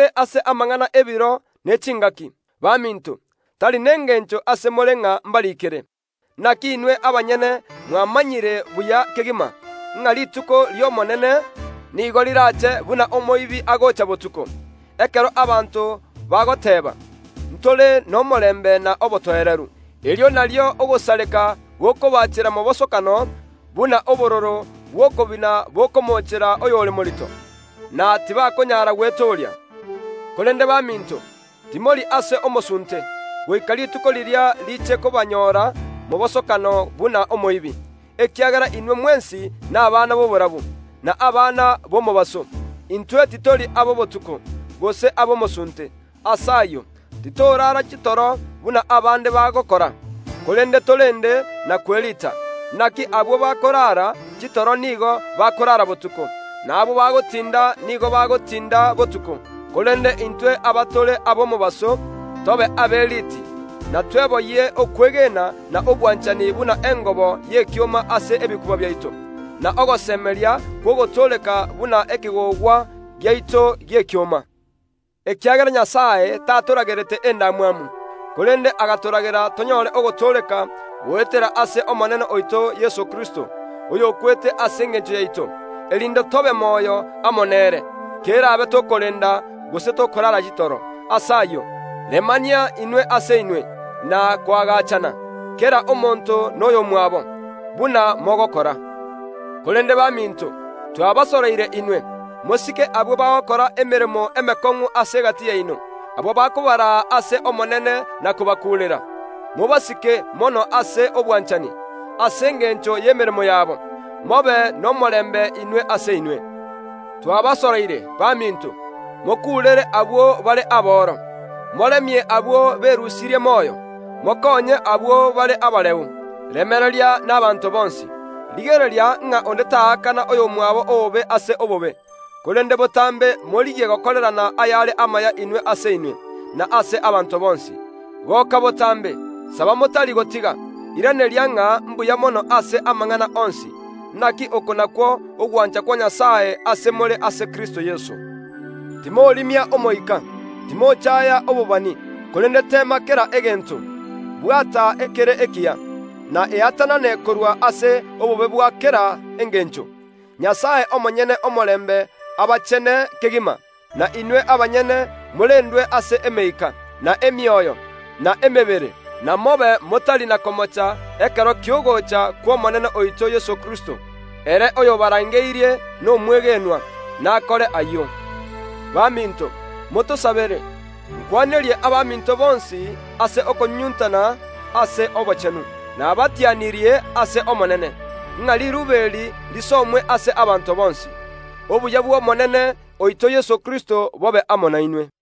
Ase amang’ana ebiro ne chingaki, baminto, tari nengencho ase more ng’a mbariikere. Naki inwe abanyene mwamanyire buya kegima, ng’a rituko ri’Omonene nigo rirache buna omoibi agocha botuko. Ekero abanto bagoteeba, “Ntore nomorembe na obotoereru”, erio nario ogosareka gokobaachera mobosokano buna obororo bw’okobina bokomoochera oyore morito, na tibakonyara gwetooria. Korende baminto, timori ase omosunte, goika rituko riria riche kobanyoora mobosokano buna omoibi, ekiagera inwe mwensi nabana b’oborabu, na abana b’omobaso. Intwe titori abobotuko, gose ab’omosunte. Ase ayio titoraara chitoro buna abande bagokora, korende torende na kweriita. Naki abwo bakorara chitoro nigo bakorara botuko, na abwo bagotinda nigo bagotinda botuko. Korende intwe abatore ab’omobaso, tobe aberiiti, na tweboyie okwegena na obwanchani buna engobo y’ekioma ase ebikuba biaito, na ogosemeria kw’ogotooreka buna ekegogwa giaito gi’ekioma. Ekiagera Nyasae tatoragerete endamwamu, korende agatoragera tonyore ogotooreka goetera ase Omonene oito Yeso Kristo, oyokwete ase engencho yaito, erinde tobe moyo amo nere, kerabe tokorenda, gose tokorara chitoro. Ase ayio, remania inwe ase inwe, na koagachana, kera omonto noyomwabo, buna mogokora. Korende baminto, twabasoroire inwe, mosike abwo bagokora emeremo emekong’u ase egati yaino, abwo bakobaraa ase Omonene na kobakuurera. Mobasike mono ase obwanchani, ase engencho y ’emeremo yabo. Mobe nomorembe inwe ase inwe. Twabasoroire, baminto, mokuurere abwo bare aboro, moremie abwo berusirie moyo, mokonye abwo bare abareu, remereria nabaanto bonsi. Rigereria ng’a onde taakana oyomwabo obobe ase obobe, korende botambe morigie gokorerana ayare amaya inwe ase inwe, na ase abanto bonsi. Goka botambe! Saba motari gotiga! Iraneria ng’a mbuya mono ase amang’ana onsi! Naki oko nakwo ogwancha kwa Nyasae ase more ase Kristo Yeso. Timorimia Omoika! Timochaaya obobani, korende teema kera egento, bwata ekere ekiya, na eatanane korwa ase obobe bwa kera engencho. Nyasae omonyene omorembe abachene kegima, na inwe abanyene morendwe ase emeika, na emioyo, na emebere, na mobe motari na komocha ekero ki’ogocha kw’Omonene oito Yeso Kristo. Ere oyobarangeirie nomwegenwa, nakore ayio. Baminto, motosabere! Nkwanerie abaminto bonsi ase okobanyunyunta ase obochenu. Nabatianirie ase Omonene, ng’a riruube eri risomwe ase abaminto bonsi. Obuya bwo Omonene oito Yeso Kristo bobe amo nainwe.